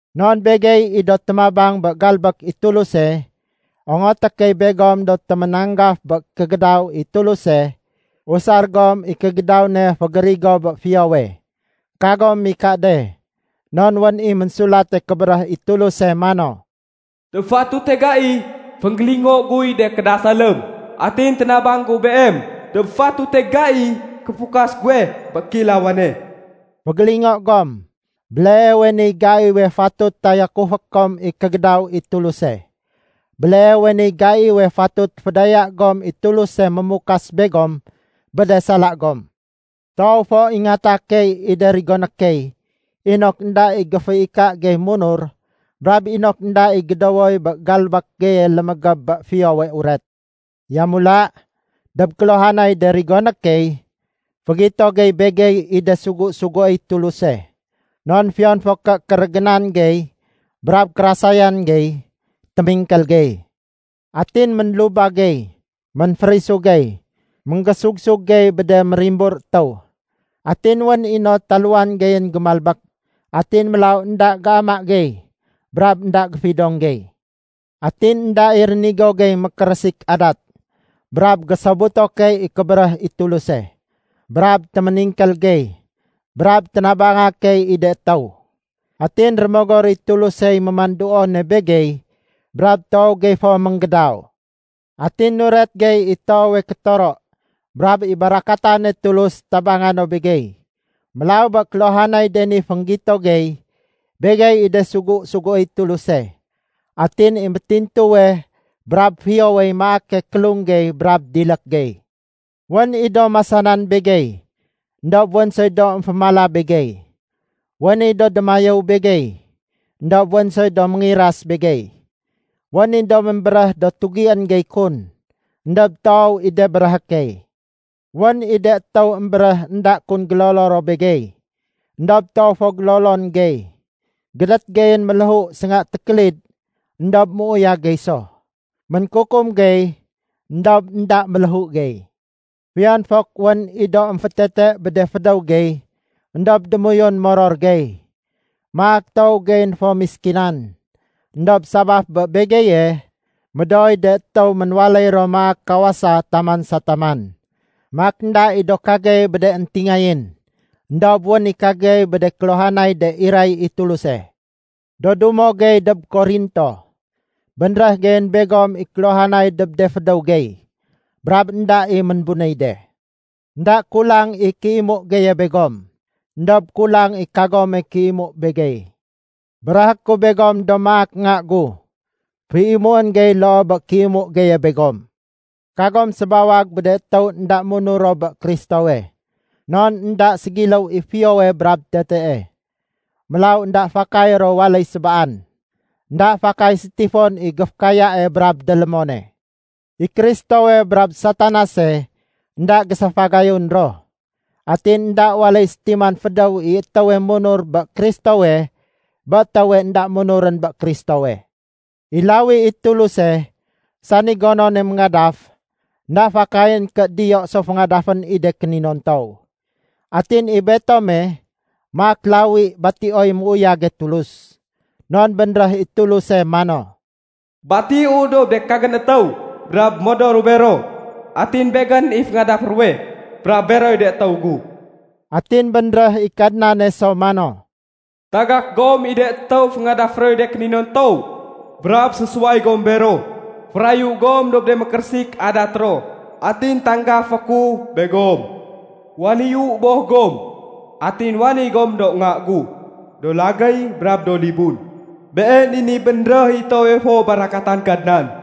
Non begey i do témabang bé galbék i Tuluse, ongoté key begom do téménanggaf bé kégédaw i Tuluse, usar gom i kégédaw ne fégérigo bé fiyowe. Kagom mika de. Non wén i Ménsulate Kébéréh i Tuluse mano, “Dob fatute gai, fénggélingo guy de kédasalém, atin ténabang gu beem dob fatute gaiy kéfukas guwe bé kéilawane.” Fégélingo gom: Béleewe niy gaiwe fatut tayakufé kom i kégédaw i Tuluse. Béleewe niy gaiwe fatut fédaya gom i Tuluse mémukas begom bé de sala gom. Toow fo ingata key i de rigoné key inok énda i géféika gey munur brab inok énda i gédowoy bé galbék geye lémégéb bé Fiyowe Uret. Yamula, dob kéluhanay de rigoné key, fégito gey begey i de sugu-suguéy Tuluse. Non fiyon fo ké kérégénan gey brab kérasayan gey, témingkél gey. Atin ménlubag gey, ménférisu gey, ménggésug-sug gey bé de mérimbur étéw. Atin wén i no taluwan geyén gémalbék, atin mélaw énda géama gey, brab énda géfidong gey. Atin énda i rénigo gey mékérésik adat, brab gésobuto key i kébéréh i Tuluse, brab téméningkél gey, brab ténabanga key i de étéw. Atin Rémogor i Tulusey mémanduone begey brab toow gey fo ménggédaw. Atin nuret gey i toowe kétoro, brab i barakatane Tulus tabanga no begey. Mélaw bé kéluhanay de ni fénggito gey, begey i de sugu-suguéy Tuluse. Atin i métintuwe brab fiyowey maake kélung gey brab dilék gey. Wén i do masanan begey, éndob wén soy do émfémala begey. Wén i do démayéw begey, éndob wén soy do méngiras begey. Wén i do ménbéréh do tugién gey kun, éndob toow i de béréhé key. Wén i de étéw émbéréh énda kun gélolo ro begey, éndob toow fo gélolon gey. Gédét geyén méléhu sénga tékélid, éndob méuyag gey so. Ménkukum gey éndob énda méléhu gey. Fiyon fok wén i do émfétete bé de fédéw gey, éndob démoyun moror gey. Maak toow geyén fo méskinan, éndob sabaf bé begeye, médooy de étéw ménwaléy ro maak kawasa taman sa taman. Maak énda i do kagey bé de éntingayén, éndob wén i kagey bé de kéluhanay de iray i Tuluse. Do dumo gey dob Korinto, bénréh geyén begom i kéluhanay dob de fédéw gey, brab énda i ménbunéy de. Enda kulang i kéimu geye begom, éndob kulang i kagome kéimu begey. Béréhé ku begom do maak nga gu, féimuén gey loo bé kéimu geye begom. Kagom sébawag bé de étéw énda munur ro bé Kristowe. Non énda ségiléw i fiyowe brab tetee, mélaw énda fakay ro waléy sébaan. Enda fakay sétifon i géfékayae brab délémone. I Kristowe brab Satanase énda géséfagayun ro. Atin énda waléy sétiman fédéw i étéwe munur bé Kristowe bé étéwe énda munurén bé Kristowe. I lawi i Tuluse, sani gonone méngadaf, énda fakayén ké diyo so féngadafén i de kéninontow. Atin i betome maak lawi batioy méuyage Tulus. Non bénréh i Tuluse mano, “Batiu dob de kagén étéw brab modoru bero. Atin begén i féngadafé ruwe, brab beroy de étéw gu.” Atin bénréh i Kadnane so mano, “Tagak gom i de étéw féngadafé roy de kéninontow brab sésuway gom bero. Férayu gom dob de mékérésik adat ro, atin tanggafé ku begom. Waléyu Boh gom, atin waléy gom do nga gu do lagéy brab do libun. Been i niy bénréh i toowe fo barakatan Kadnan.”